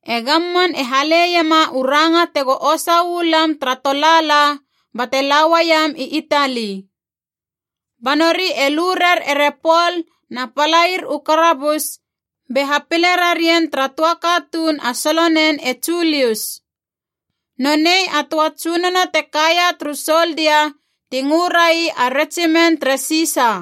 E gamman e hale iema u ranga tego osa uu lam tara tolaala bate la uaiem i Itali. Ba nori e lu rer ere Pol na palair u karabus be hapile rarien tara töa katuun a solonen e Julius. Nonei a töa tsunono te kaia turu soldia ti ngö rai a Retsimen tere Sisa.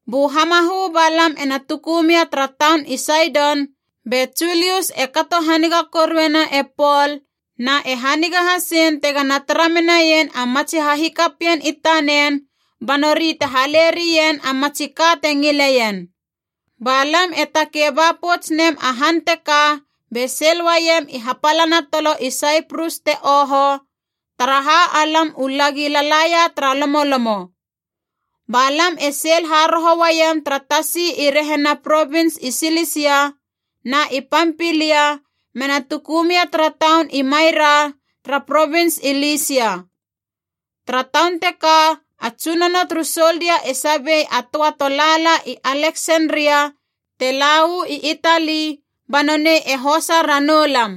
Bu hamahö ba lam ena tuku mia tara taun i Saidon be Julius e kato haniga koruena e Pol na e haniga hasein tegana tara menaien a matsi hahikapien i tanen ba nori te hale rien a matsi ka te ngileien. Ba lam e takei ba pouts nem a han teka be seil uaiem i hapalana tolo i Saiprus te oho, taraha alam u lagi lalaia tara lomolomo. Ba lam e seil haroho uaiem tara tasi i rehina provins i Silisia na i Pampilia mena tuku mia tara taun i Maira tara provins i Lisia. Tara taun teka a tsunono turu soldia e sabei a töa tolaalana i Aleksenria te la uu i Itali, ba nonei e hosa ranou lam.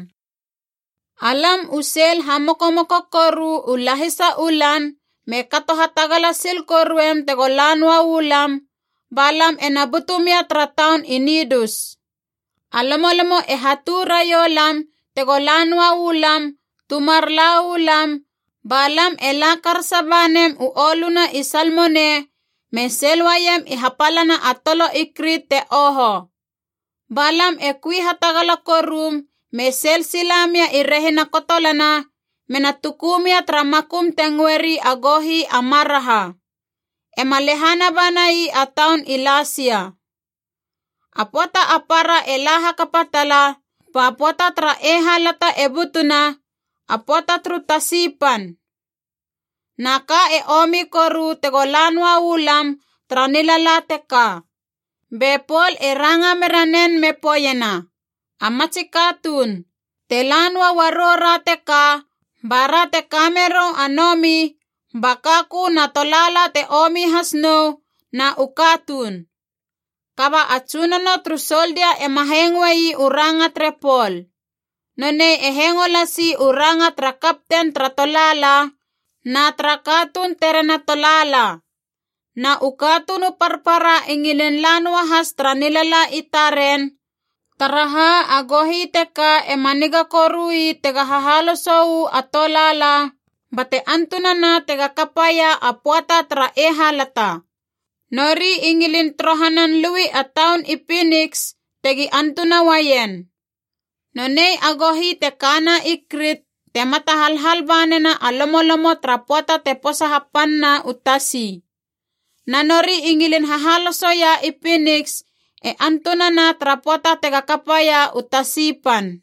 Alam u seil hamokomoko koru u lahisa u lan me kato hatagala sil koruem tego la noa uu lam, ba lam ena butu mia tara taun i Nidus. A lomolomo e hatu raiou lam tego la noa uu lam tu mar la uu lam, ba lam e la karasa ba nem u oluna i Salmone me seil uaiem i hapalana a tolo i Krit te oho. Ba lam e kui hatagala korum me seil sila mia i rehina kotolana me na tuku mia tara makum te ngöeri a Gohi a Maraha. Ema lehana banai a taun i Lasia. A pöata a para e la hakapa tala, ba pöata tara eihalata e butuna, a pöata turu tasi pan. Na ka e omi koru tego la noa u lam tara nilala teka. Be Pol e ranga mera nen me poeiena, “A matsi katuun, te la noa uarou ra teka bara te ka merou a nomi, ba kakö na tolaala te omi has nou, na u katuun.” Kaba a tsunono turu soldia ema hengoi u ranga tere Pol. Nonei e hengo lasi u ranga tara kapten tara tolaala na tara katuun tere na tolaala. Na u katuun u parpara i ngilin la noahas tara nilala i taren, taraha a gohi teka ema niga korui tega hahaloso uu a tolaala bate antunana tega kapaia a pöata tara eihalata. Nori i ngilin torohanan lui a taun i Piniks, tegi antuna uaien. Nonei a gohi te kana i Krit te mata halhal ba nena a lomolomo tara pöata te posa hapanna u tasi. Na nori i ngilin hahalosoia i Piniks e antunana tara pöata tega kapaia u tasi pan.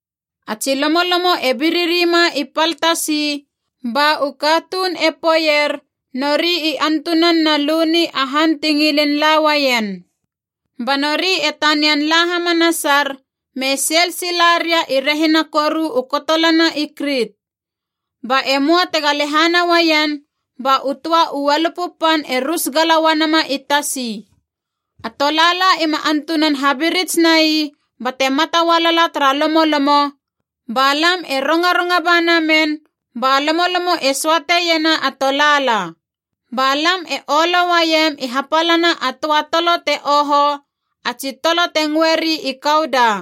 A tsi lomolomo e biririma i pal tasi, ba u katuun e poeier nori i antunan na luni a han ti ngilin la uaien. Ba nori e tanian la hamanasar me seil sila ria i rehina koru u kotolana i Krit. Ba e möa tega lehana uaien, ba u töa u ualupu pan e rus gala uanama i tasi. A tolaala ima antunan habirits nai bate mata ualala tara lomolomo, ba lam e rongaronga ba namen ba lomolomo e söate iena a tolaala. Ba lam e olo uaiem i hapalana a töa tolo te oho, a tsi tolo te ngöeri i Kauda.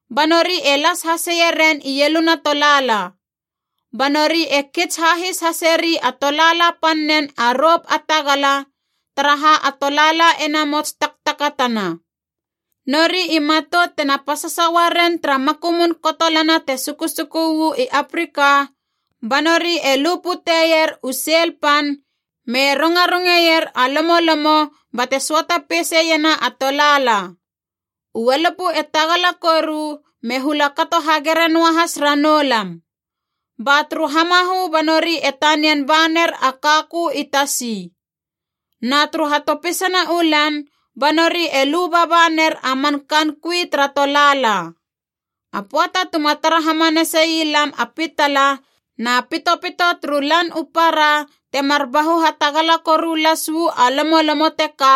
Ba nori e las haseie ren ieluna tolaala. Ba nori e kits hahis haseri a tolaala pannen a rop a tagala, taraha a tolaala e namots taktakatana. Nori i matout tena pasasa uaren tara makumun kotolana te sukusuku uu i Afrika, ba nori e lu puteier u seil pan me rongarongeier a lomolomo bate söata peise iena a tolaala. U ualupu e tagala koru me hula kato hagere noahas ranou lam. Ba turu hamahö ba nori e tanian ba ner a kakö i tasi. Na turu hatopisana u lan ba nori e lu baba ner a man kaan kui tara tolaala. A pöata tuma tara hamanasei lam a pitala na pitopito turu lan u para temar bahu hatagala koru las uu a lomolomo teka,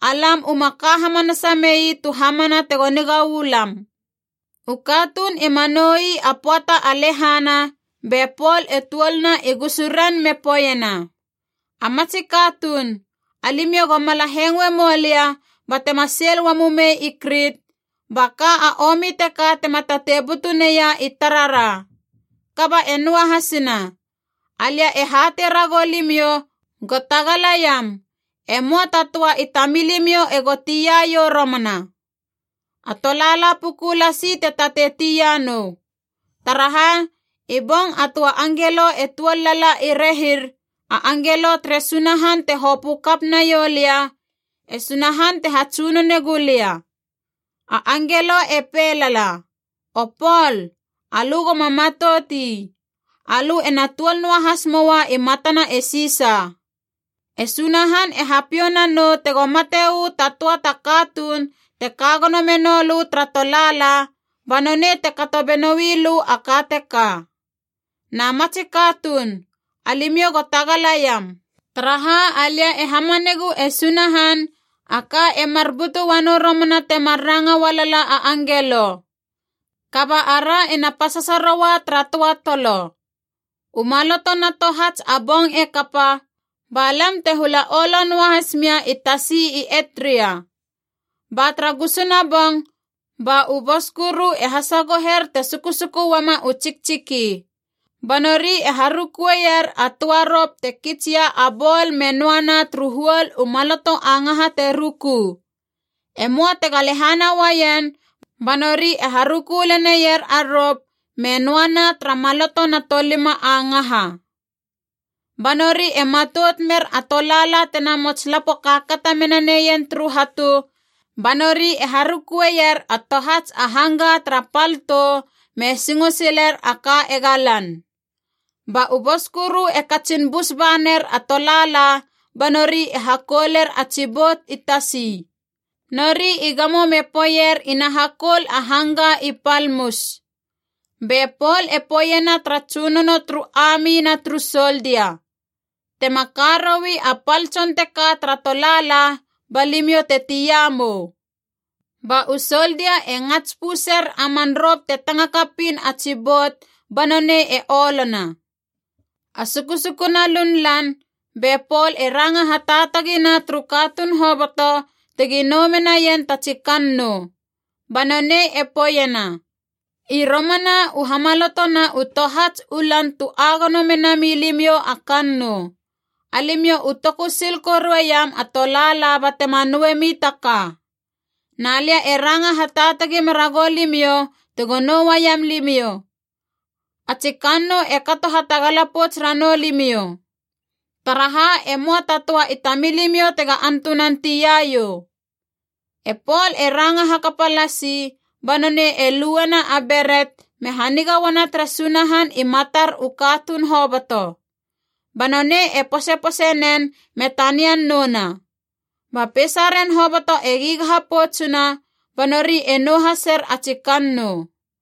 alam uma ka hamanasa mei tu hamana tego niga uu lam. U katuun ima nou ii a pöata a lehana, be Pol e tuolna i gusuren me poeiena, “A matsi katuun, alimiou go mala hengoe moulia ba tema seil uamumei i Krit, ba ka a omi teka tema tatei butu neia i tarara. Kaba e noahasina. Alia e hatei ragou limiou go tagalaiam, e möa ta töa i tamilimiou ego tia iou romana. A tolaala puku lasi te tatei tia nou. Taraha, i bong a töa angelo e tuol lala i rehir, a angelo tere Sunahan te hopö kap naiou lia, e Sunahan te hatsunone gulia. A angelo e pei lala, ‘O Pol, alö goma matout ii. Alö ena tuol noahas moa i matana e Sisa. E Sunahan e hapiou nanou tego mate uu ta töa ta katuun te ka gono menou lö tara tolaala, ba nonei te kato benoui lö a ka teka.’ Na matsi katuun, alimiou go tagalaiam, taraha alia e hamanegu e Sunahan, a ka e mar butu uanou romana temar ranga ualala a angelo. Kaba ara ena pasasa roua tara töa tolo.” U maloto na tohats a bong e kapa, ba lam te hula olo noa has mia i tasi i Edria. Ba tara gusuna bong ba u boskuru e hasagoher te sukusuku uama u tsiktsiki. Ba nori e harukueier a töa rop te kitsia a bol me noana turu huol u maloto a ngaha te ruku. E möa tega lehana uaien ba nori e haruku leneier a rop me noana tara maloto na tolima a ngaha. Ba nori e matout mer a tolaala tena mots lapo kaakata mena neien turu hatu, ba nori e harukueier a tohats a hangga tara pal tou me singo siler a ka ega lan. Ba u boskuru e katsin bus ba ner a tolaala ba nori e hakouler a tsi bout i tasi. Nori i gamo me poeier ina hakoul a hangga i pal mus. Be Pol e poeiena tara tsunono turu ami na turu soldia, “Tema ka roui a pal tson teka tara tolaala, ba limiou te tia mou!” Ba u soldia e ngats puser a man rop te tanga kapiin a tsi bout ba nonei e olona. A sukusukuna lunlan be Pol e ranga hataatagina turu katuun hoboto tegi nou menaien ta tsi kannou. Ba nonei e poeiena, “I romana u hamaloto na u tohats u lan tu agono menami limiou a kannou. Alimiou u toku sil korueiam a tolaala batema nouemi ta ka. Na lia e ranga hataatagi mera goulimiou tego nou uaiam limiou. A tsi kannou e kato hatagala pouts ranou limiou. Taraha e möa ta töa i tamilimiou tega antunan tia iou.” E Pol e ranga hakapa lasi ba nonei e luena a beret me haniga uana tere Sunahan i matar u katuun hoboto. Ba nonei e posepose nen me tanian nouna. Ba peisaren hoboto e gigaha poutsuna ba nori e nou haser a tsi kannou.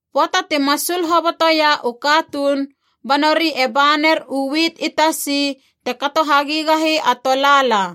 Pöata ti masul hobotoia u katuun ba nori e ba ner u wit i tasi te kato hagigahi a tolaala.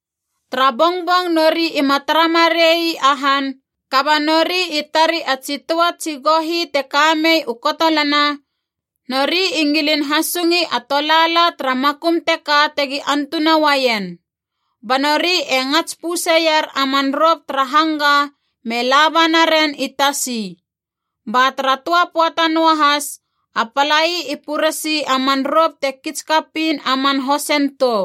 Tara bongbong nori ima tara marei a han, kaba nori i tari a tsi töa tsi gohi te ka mei u kotolana, nori i ngilin hasungi a tolaala tara makum teka tegi antuna uaien. Ba nori e ngats puseier a man rop tara hangga me laba naren i tasi. Ba tara töa pöata noahas a palai i puresei a man rop te kits kapiin a man hosen tou.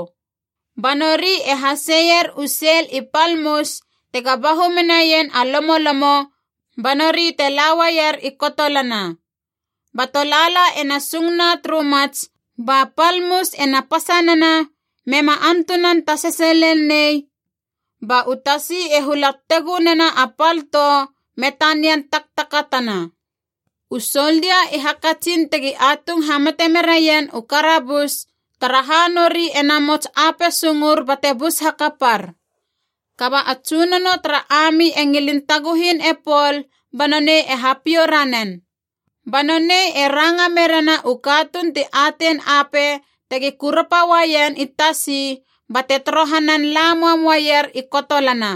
Ba nori e haseier u seil i pal mus tega bahu menaien a lomolomo ba nori te la uaier i kotolana. Ba tolaala e na sungna turu mats ba pal mus ena pasanana mema antunan tasese lel nei, ba u tasi e hula tegu nena a pal tou me tanian taktakatana. U soldia i hakatsin tegi atung hamate meraien u karabus, taraha nori e namots ape sungor bate bus hakapar. Kaba a tsunono tara ami e ngilin taguhin e Pol ba nonei e hapiou ranen. Ba nonei e ranga merena u katuun ti atein ape tegi kurapa uaien i tasi bate torohanan la mam uaier i kotolana.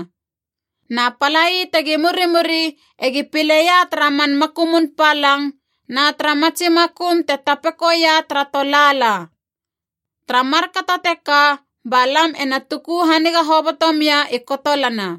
Na palai tegi murimuri egi pileia tara man makumun palang na tara matsi makum te tapekoia tara tolaala. Tara markato teka ba lam ena tuku haniga hoboto mia i kotolana.